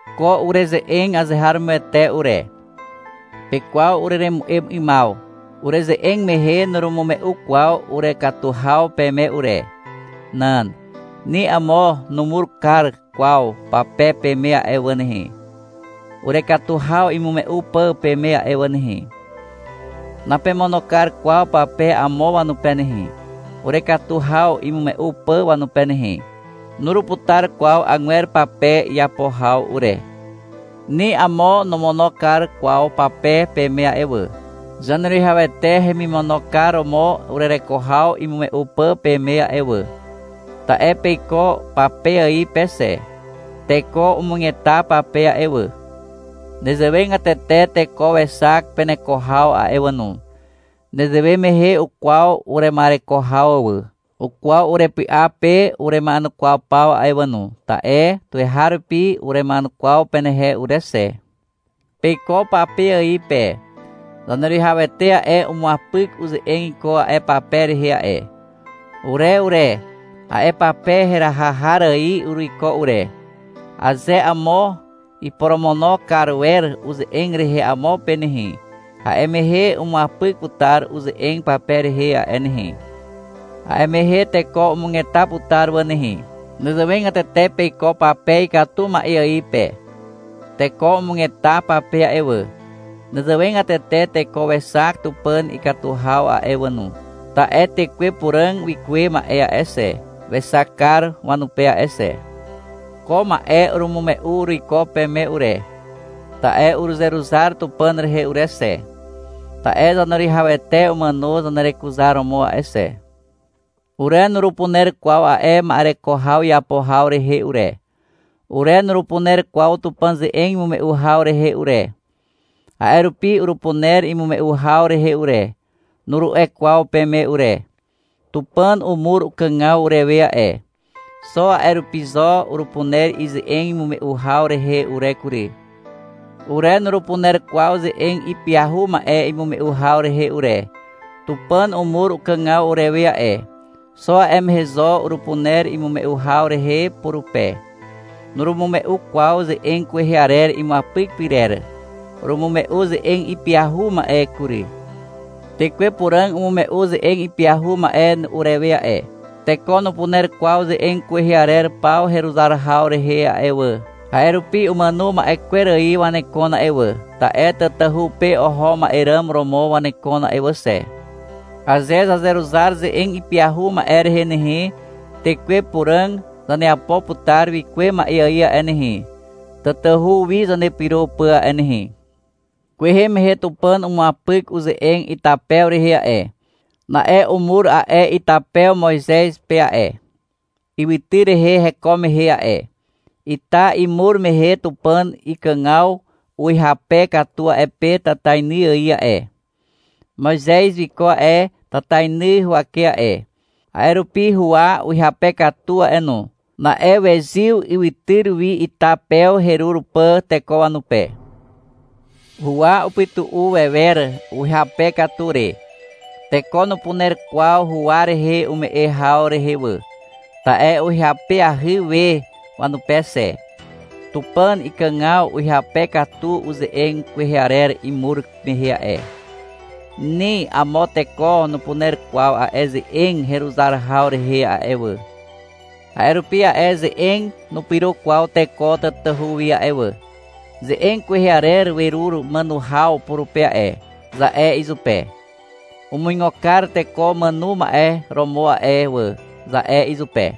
Ko ureze'eg azeharomoete ure. Pekwaw ureremu'em 'ymaw. Ureze'eg mehe nurumume'u kwaw urekatu haw peme ure. Nan. Ni amo numur kar kwaw pape peme a'e wà nehe, urekatu haw imume'u pà peme a'e wà nehe. Napemono kar kwaw pape amo wanupe nehe, urekatu haw imume'u pà wanupe nehe. Nuruputar kwaw agwer pape iapo haw ure. Ni amo nomono kar kwaw pape peme a'e wà, Zaneruwihawete hemimono kar romo urereko haw imume'u pà peme a'e wà. Ta'e peiko pape ài pe xe. Teko umugeta pape a'e wà. Nezewegatete teko wexak peneko haw a'e wà no. Nezewe mehe ukwaw urema'ereko haw wà. Ukwaw urepy'a pe urema'enukwaw paw a'e wà no, ta'e tuweharupi urema'enukwaw penehe ure xe. Peiko pape ài pe. Zaneruwihawete a'e, umuapyk uze'eg iko a'e pape rehe a'e. Ure ure, a'e pape heraha har ài uruiko ure. Aze amo iporomono kar wer uze'eg rehe amo pe nehe, a'e mehe umuapyk putar uze'eg pape rehe a'e nehe. A'e mehe teko umugeta putar wà nehe. Nezewegatete peiko pape ikatu ma'e ài pe. Teko umugeta pape a'e wà. Nezewegatete teko wexak Tupàn ikatu haw a'e wà no. Ta'e Tekwe Puràg wikuwe ma'e a'e xe, wexak kar wanupe a'e xe. Ko ma'e urumume'u uruiko peme ure, ta'e uruzeruzar Tupàn rehe ure xe, ta'e Zaneruwihawete umàno zanerekuzaromo a'e xe. Ure nurupuner kwaw a'e ma'ereko haw iapo haw rehe ure. Ure nurupuner kwaw Tupàn ze'eg imume'u haw rehe ure. A'e rupi — Urupuner imume'u haw rehe ure, nuru'e kwaw peme ure. Tupàn umur ukàgaw urewe a'e. Xo a'e rupi zo urupuner ize'eg imume'u haw rehe ure kury. Ure nurupuner kwaw ze'eg ipyahu ma'e imume'u haw rehe ure. Tupàn umur ukàgaw urewe a'e. Xo a'e mehe zo urupuner imume'u haw rehe purupe. Nurumume'u kwaw ze'eg kwehe arer imuapyk pyrer. Urumume'u ze'eg ipyahu ma'e kury. Tekwe Puràg umume'u ze'eg ipyahu ma'e urewe a'e. Teko nupuner kwaw ze'eg kwehe arer paw heruzar haw rehe a'e wà, a'e rupi umàno ma'e kwer ài wanekon a'e wà, ta'e tatahu pe oho ma'e ràm romo wanekon a'e wà xe. Aze zazeruzar ze'eg ipyahu ma'e rehe nehe, Tekwe Puràg zaneapo putar wikuwe ma'e ài a'e nehe, tatahu wi zanepyro pà a'e nehe. Kwehe mehe Tupàn umuapyk uze'eg itapew rehe a'e. Na'e umur a'e itapew Moizez pe a'e, ywytyr rehe heko mehe a'e. Ita imur mehe Tupàn ikàgaw uhyape katu a'e pe tatainy ài a'e. Moizez wiko a'e tatainy huwake a'e. A'e rupi huwa uhyape katu a'e no. Na'e wezyw ywytyr wi, ita pew herur pà teko wanupe. Huwa upytu'u wewer uhyape katu re. Teko nupuner kwaw huwa rehe ume'e haw rehe wà, ta'e uhyapeahy we wanupe xe. Tupàn ikàgaw uhyape katu uze'eg kwehe arer imur mehe a'e. Ni amo teko nupuner kwaw a'e ze'eg heruzar haw rehe a'e wà. A'e rupi a'e ze'eg nupyro kwaw teko tatahu wi a'e wà. — Ze'eg kwehe arer werur màno haw purupe a'e, za'e izupe. — Umuigo kar teko umàno ma'e romo a'e wà, za'e izupe.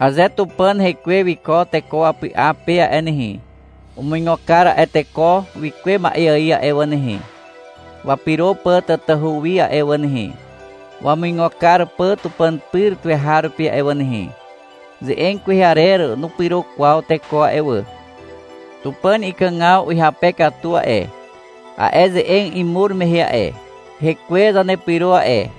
Aze Tupàn Hekwe wiko teko wapy'a pe a'e nehe, umuigo kar a'e teko wikuwe ma'e ài a'e wà nehe, wapyro pà tatahu wi a'e wà nehe, wamuigo kar pà Tupàn pyr tuweharupi a'e wà nehe. Ze'eg kwehe arer nupyro kwaw teko a'e wà. Tupàn ikàgaw uhyape katu a'e, a'e ze'eg imur mehe a'e. Hekwe zanepyro a'e.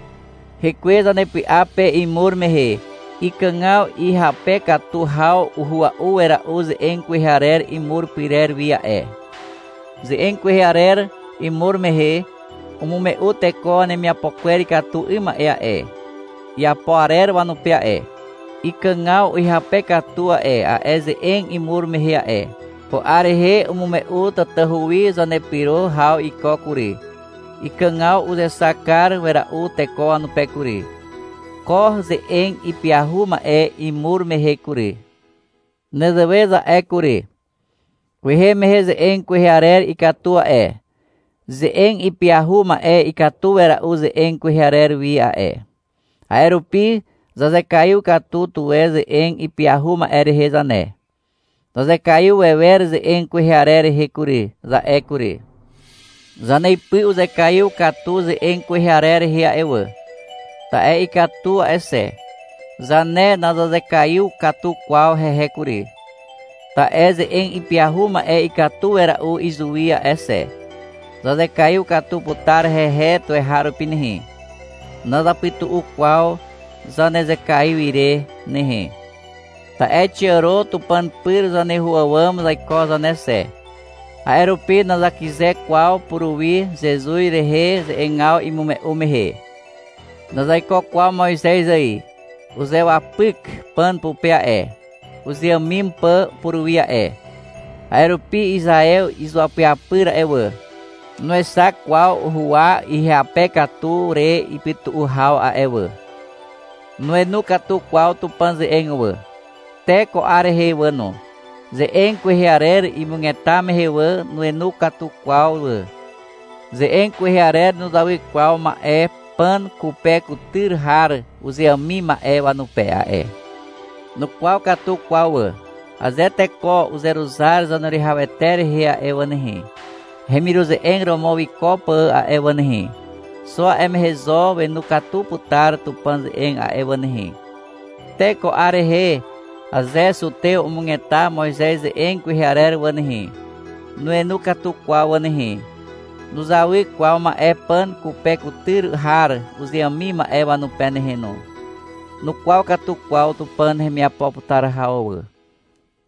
Hekwe zanepy'a pe imur mehe, ikàgaw ihyape katu haw uhua'u wera'u ze'eg kwehe arer imur pyrer wi a'e. Ze'eg kwehe arer imur mehe, umume'u teko wanemiapo kwer ikatu 'ym ma'e a'e, iapo arer wanupe a'e. Ikàgaw uhyape katu a'e, a'e ze'eg imur mehe a'e. Ko 'ar rehe umume'u tatahu wi zanepyro haw iko kury. Ikàgaw uzexak kar wera'u teko wanupe kury, ko ze'eg ipyahu ma'e imur mehe kury. Nezewe za'e kury. — Kwehe mehe ze'eg kwehe arer ikatu a'e. Ze'eg ipyahu ma'e ikatu wera'u ze'eg kwehe arer wi a'e. A'e rupi zazekaiw katu tuwe ze'eg ipyahu ma'e rehe zane. Zazekaiw wewer ze'eg kwehe arer rehe kury, za'e kury. Zaneipy uzekaiw katu ze'eg kwehe arer rehe a'e wà, ta'e ikatu a'e xe. Zane nazazekaiw katu kwaw hehe kury, ta'e ze'eg ipyahu ma'e ikatu wera'u izuwi a'e xe. Zazekaiw katu putar hehe tuweharupi nehe. Nazapytu'u kwaw zanezekaiw ire nehe. Ta'e xiàro Tupàn pyr zaneho àwàm zaiko zane xe. A'e rupi nazakyze kwaw puruwi, Zezuz rehe ze'egaw imume'u mehe. Nazaiko kwaw Moizez ài. Uzewapyk pàn pupe a'e, uzeàmim pà puruwi a'e. A'e rupi Izaew izuapyapyr a'e wà, nuexak kwaw huwa ihyape katu re ipytu'u haw a'e wà. Nuenu katu kwaw Tupàn ze'eg wà. Te ko 'ar rehe wà no, ze'eg kwehe arer imugeta mehe wà, nuenu katu kwaw wà. Ze'eg kwehe arer nuzawy kwaw ma'e pàn kupe kutyr har uzeàmim ma'e wanupe a'e. Nukwaw katu kwaw wà. Aze teko uzeruzar Zaneruwihawete rehe a'e wà nehe, hemiruze'eg romo wiko pà a'e wà nehe, xo a'e mehe zo wenu katu putar Tupàn ze'eg a'e wà nehe. Te ko 'ar rehe, aze zutew umugeta Moizez ze'eg kwehe arer wà nehe, nuenu katu kwaw wà nehe. Nuzawy kwaw ma'e pàn kupe kutyr har uzeàmim ma'e wanupe nehe no. Nukwaw katu kwaw Tupàn hemiapo putar haw wà.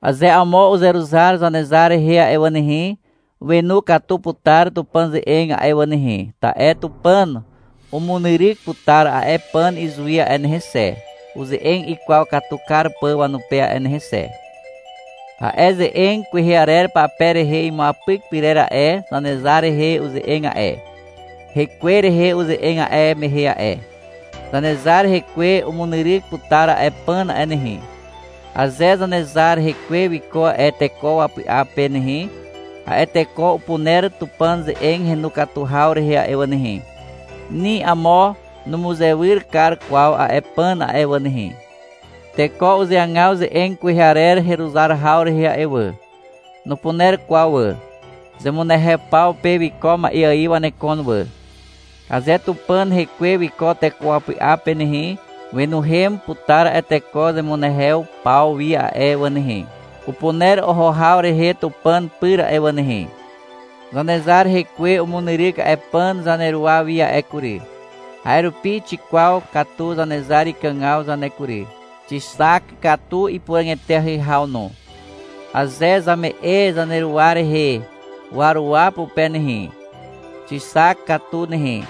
Aze amo uzeruzar Zanezar rehe a'e wà nehe, wenu katu putar Tupàn ze'eg a'e wà nehe, ta'e Tupàn umunyryk putar a'e pàn izuwi a'e nehe xe, uze'eg ikwaw katu kar pà wanupe a'e nehe xe. A'e ze'eg kwehe arer pape rehe imuapyk pyrer a'e, Zanezar rehe uze'eg a'e. Hekwe rehe uze'eg a'e mehe a'e. Zanezar hekwe umunyryk putar a'e pàn a'e nehe. Aze Zanezar hekwe wiko a'e teko wapy'a pe nehe, a'e teko upuner Tupàn ze'eg henu katu haw rehe a'e wà nehe. Ni amo numuzewyr kar kwaw a'e pàn a'e wà nehe. Teko uzeagaw ze'eg kwehe arer heruzar haw rehe a'e wà. Nupuner kwaw wà. Zemunehew paw pe wiko ma'e ài wanekon wà. Aze Tupàn Hekwe wiko teko wapy'a pe nehe, wenuhem putar a'e teko zemunehew paw wi a'e wà nehe. Upuner oho haw rehe Tupàn pyr a'e wà nehe. Zanezar hekwe umunyryk a'e pàn zaneruwa wi a'e kury. A'e rupi xikwaw katu Zanezar ikàgaw zane kury. Xixak katu ipuràg eteahy haw no. Aze zame'e zaneruwa rehe waruwa pupe nehe, xixak katu nehe.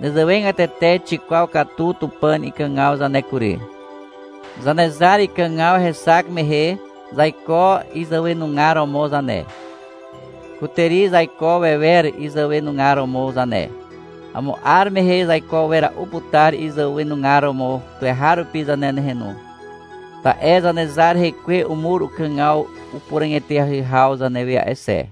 Nezewegatete xikwaw katu Tupàn ikàgaw zane kury. Zanezar ikàgaw hexak mehe, zaiko izàwenugar romo zane. Kutàri zaiko wewer izàwenugar romo zane. Amo 'ar mehe zaiko wera'u putar izàwenugar romo tuweharupi zane nehe no. Ta'e Zanezar hekwe umur ukàgaw upuràg eteahy haw zanewe a'e xe.